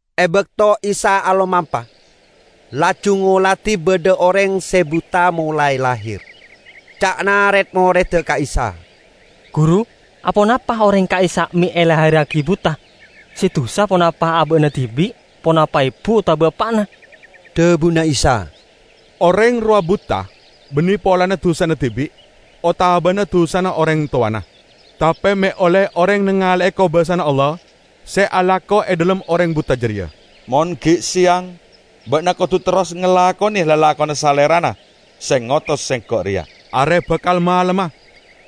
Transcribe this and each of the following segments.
E bakto Isa alomampa, laju ngoladi badha oreng se buta molae lahir. Ca'na red-moredda ka Isa, "Guru, aponapa oreng ka'issa' me' elahirragi buta? Se dusa ponapa aba'na dibi', ponapa ebu otaba eppa'na?" Dhabuna Isa, "Oreng rowa buta banne polana dusana dibi' otabana dusana oreng towana, tape me' olle oreng nangale'e kobasana Allah se alako e dhalem oreng buta jareya. Mon gi' seyang, ba'na kodu terros ngalakone lalakonna Salerana se ngotos Sengko' reya. Are bakal malemma,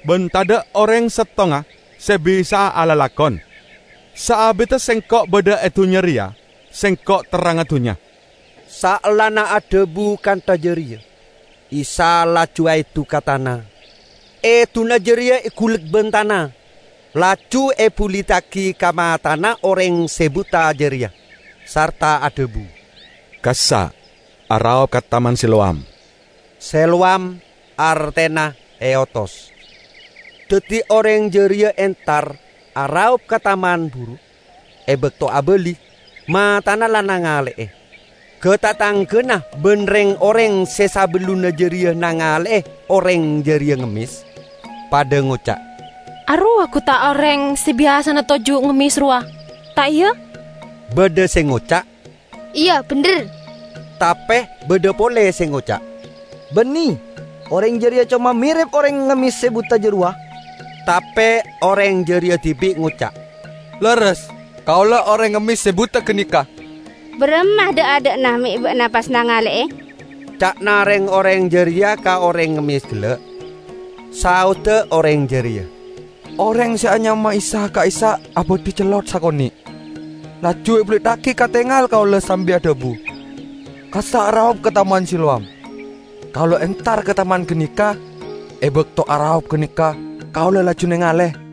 ban tadha' oreng settonga se bisa'a alalakon. Saabidda Sengko' badha e dunnya reya, Sengko' terrangnga dunnya." Saellana adhabu kantha jareya Isa laju aedu ka tana; eduna jareya egulek ban tana, laju ebuliddagi ka matana oreng se buta jareya, sarta adhabu, "Kassa' araop ka Taman Siloam." (Siloam artena "eotos"). Daddi oreng jareya entar araop ka taman buru. E bakto abali, matana la nangale'e. Ga-tatanggana ban reng-oreng se sabellunna jareya nangale'e oreng jareya ngemmes, padha ngoca', "Arowa gu ta' oreng se biyasana toju' ngemmes rowa, ta' iya?" Badha se ngoca', "Iya, bendher." Tape badha pole se ngoca', "Banne, oreng jareya coma merep oreng ngemmes se buta jarowa." Tape oreng jareya dibi' ngoca', "Lerres, kaula oreng ngemmes se buta ganeka." "Baramma dha'-adha'na me' ba'na pas nangale'e?" ca'na reng-oreng jareya ka oreng ngemmes gella'. Saodda oreng jareya, "Oreng se anyama Isa ka'issa' abadhi cellot sakone', laju ebuliddagi ka tengal kaula sambi adhabu, 'Kassa' araop ka Taman Siloam.' Kaula entar ka taman ganeka; e bakto araop ganeka kaula laju nengale."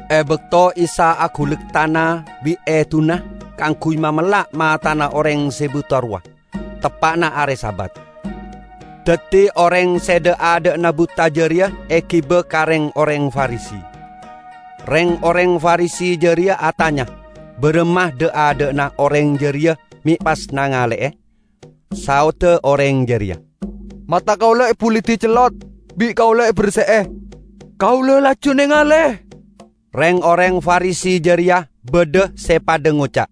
E bakto Isa agulek tana bi' eduna kaangguy mamella' matana oreng se buta rowa teppa'na are Sabat. Daddi oreng se dha'-adha'na buta jareya egiba ka reng-oreng Farisi. Reng-oreng Farisi jareya atanya baramma dha'-adha'na oreng jareya me' pas nangale'e. Saodda oreng jareya, "Mata kaula ebulidi cellot, bi' kaula eberse'e, kaula laju nengale." Reng-oreng Farisi jareya badha se padha ngoca',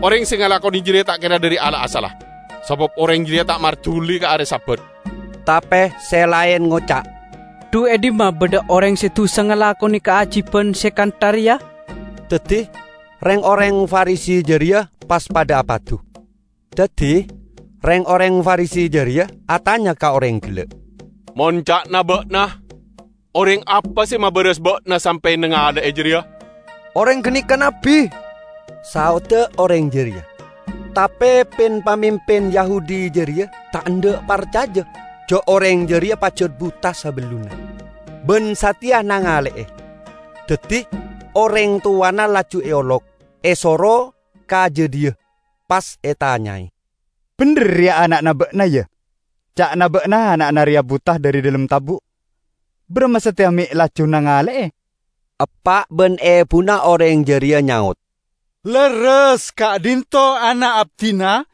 "Oreng se ngalakone jareya ta' kera dhari Allah asalla, sabab oreng jareya ta' marduli ka are Sabat." Tape se laen ngoca', "Dhu e dhimma badha oreng se dusa ngalakone kaajiban se kantha reya?" Daddi reng-oreng Farisi jareya pas padha apadu. Daddi reng-oreng Farisi jareya atanya ka oreng gella', "Mon ca'na ba'na, oreng apa se mabaras ba'na sampe' nangale'e jareya?" "Oreng ganeka nabbi," saodda oreng jareya. Tape pin-pamimpin Yahudi jareya ta' endha' parcaja ja' oreng jareya pajat buta sabellunna, ban sateya nangale'e. Daddi oreng towana laju eolok, esoro ka jadhiya, pas etanyae, "Bendher reya ana'na ba'na, ya? Ca'na ba'na ana'na reya buta dhari dhalem tabu'. Baramma sateya me' laju nangale'e?" Eppa' ban ebuna oreng jareya nyaot, "Lerres ka'dhinto' ana' abdina,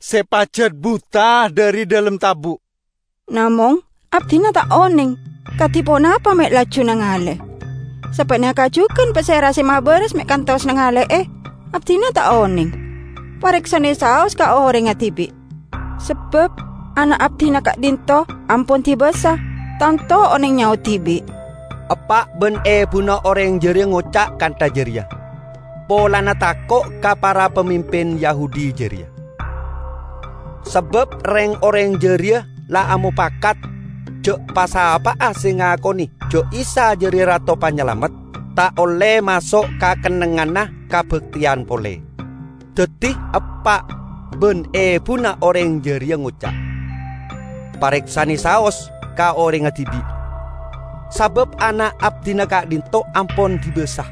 se pajat buta dhari dhalem tabu'. Namong abdina ta' oneng kadi ponapa me' laju nengale. Sapaneka jugan pasera se mabaras me' kantos nangale'e, abdina ta' oneng. Pareksane saos ka orengnga dibi', sabab ana' abdina ka'dhinto' ampon dibasa; tanto oneng nyaot dibi'." Eppa' ban ebuna oreng jareya ngoca' kantha jareya polana tako' ka para pamimpin Yahudi jareya; sabab reng-oreng jareya la amopakat ja' pa'-sapa'a se ngakone ja' Isa jareya Rato Panyalamet, ta' olle maso' ka kennengnganna kabakteyan pole. Daddi eppa' ban ebuna oreng jareya ngoca', "Pareksane saos ka orengnga dibi', sabab ana' abdina ka'dhinto' ampon dibasa."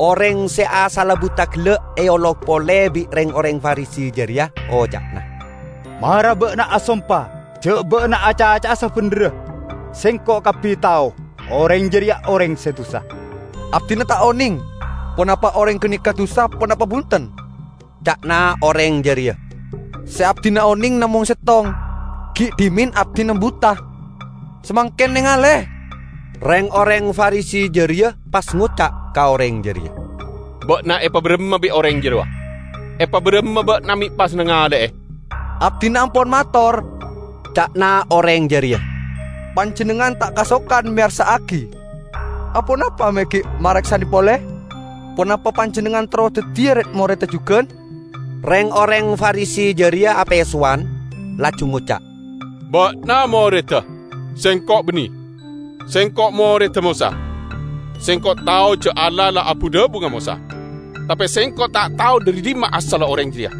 Oreng se asalla buta gella' eolok pole bi' reng-oreng Farisi jareya; oca'na, "Mara ba'na asompa ja' ba'na acaca'a sabendherra. Sengko' kabbi tao oreng jareya oreng se dusa." "Abdina ta' oneng ponapa oreng ganeka dusa ponapa bunten," ca'na oreng jareya, "se abdina oneng namong settong: gi' dhimen abdina buta, samangken nengale." Reng-oreng Farisi jareya pas ngoca' ka oreng jareya, "Ba'na epabaramma bi' oreng jarowa? Epabaramma ba'na me' pas nangale'e?" "Abdina ampon mator," ca'na oreng jareya, "panjennengngan ta' kasokan meyarsa'agi. Aponapa me' gi' mareksane pole? Ponapa panjennengngan terro daddiya red-moredda jugan?" Reng-oreng Farisi jareya apesowan, laju ngoca', "Ba'na moredda; sengko' banne! Sengko' moredda Mosa. Sengko' tao ja' Allah la abu-dhabu ka Mosa. Tape sengko' ta' tao dhari dhimma asalla oreng jareya."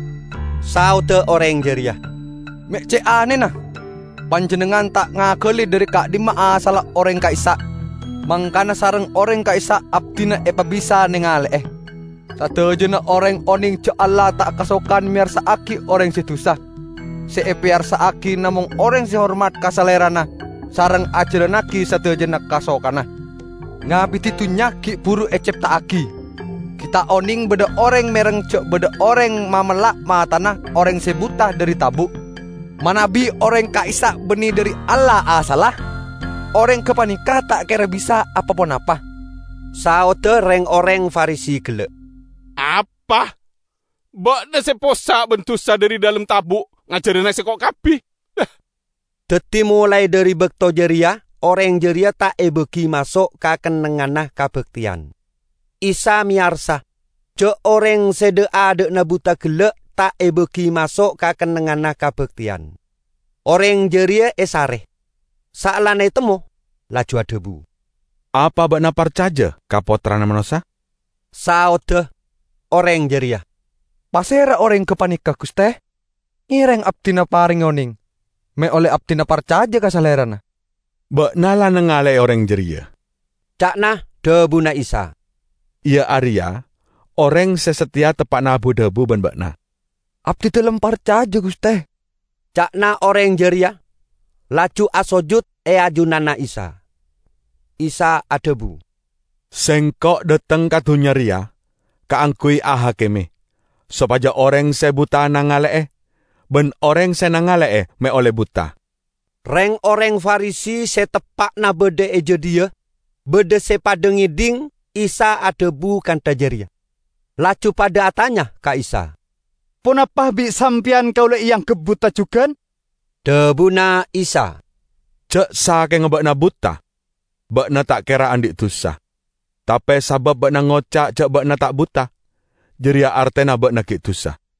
Saodda oreng jareya, "Me' ce' anena! Panjennengngan ta' ngagali dhari ka'dhimma asalla oreng ka'issa', mangkana sareng oreng ka'issa' abdina epabisa nangale'e. Sadajana oreng oneng ja' Allah ta' kasokan meyarsa'agi oreng se dusa; se epeyarsa'agi namong oreng se hormat ka Salerana sareng ajalannagi sadajana kasokanna. Ngabidi dunnya gi' buru ecepta'agi gi' ta' oneng badha oreng mereng ja' badha oreng mamella' matana oreng se buta dhari tabu'. Manabi oreng ka'issa' banne dhari Allah asalla, oreng gapaneka ta' kera bisa apa-ponapa." Saodda reng-oreng Farisi gella', "Apa? Ba'na se possa' ban dusa dhari dhalem tabu' ngajarana sengko' kabbi?" Daddi molae dhari bakto jareya oreng jareya ta' ebagi maso' ka kennengnganna kabakteyan. Isa meyarsa ja' oreng se dha'-adha'na buta gella' ta' ebagi maso' ka kennengnganna kabakteyan. Oreng jareya esare; saellana etemmo laju adhabu, "Apa ba'na parcaja ka Pottrana Manossa?" Saodda oreng jareya, "Pasera oreng gapaneka, Guste? Ngereng abdina parenge oneng me' olle abdina parcaja ka Salerana." "Ba'na la nangale'e oreng jareya," ca'na dhabuna Isa, "iya areya oreng se sateya teppa'na abu-dhabu ban ba'na." "Abdidalem parcaja, Guste," ca'na oreng jareya, laju asojud e ajunanna Isa. Isa adhabu, "Sengko' dhateng ka dunnya reya kaangguy ahakime, sopaja oreng se buta nangale'e, ban oreng se nangale'e me' olle buta." Reng-oreng Farisi se teppa'na badha e jadhiya badha se padha ngedhing Isa adhabu kantha jareya, laju padha atanya ka Isa, "Ponapa bi' Sampeyan kaula eanggep buta jugan?" Dhabuna Isa, "Ja' sakenga ba'na buta, ba'na ta' kera andhi' dusa. Tape sabab ba'na ngoca' ja' ba'na ta' buta, jareya artena ba'na gi' dusa."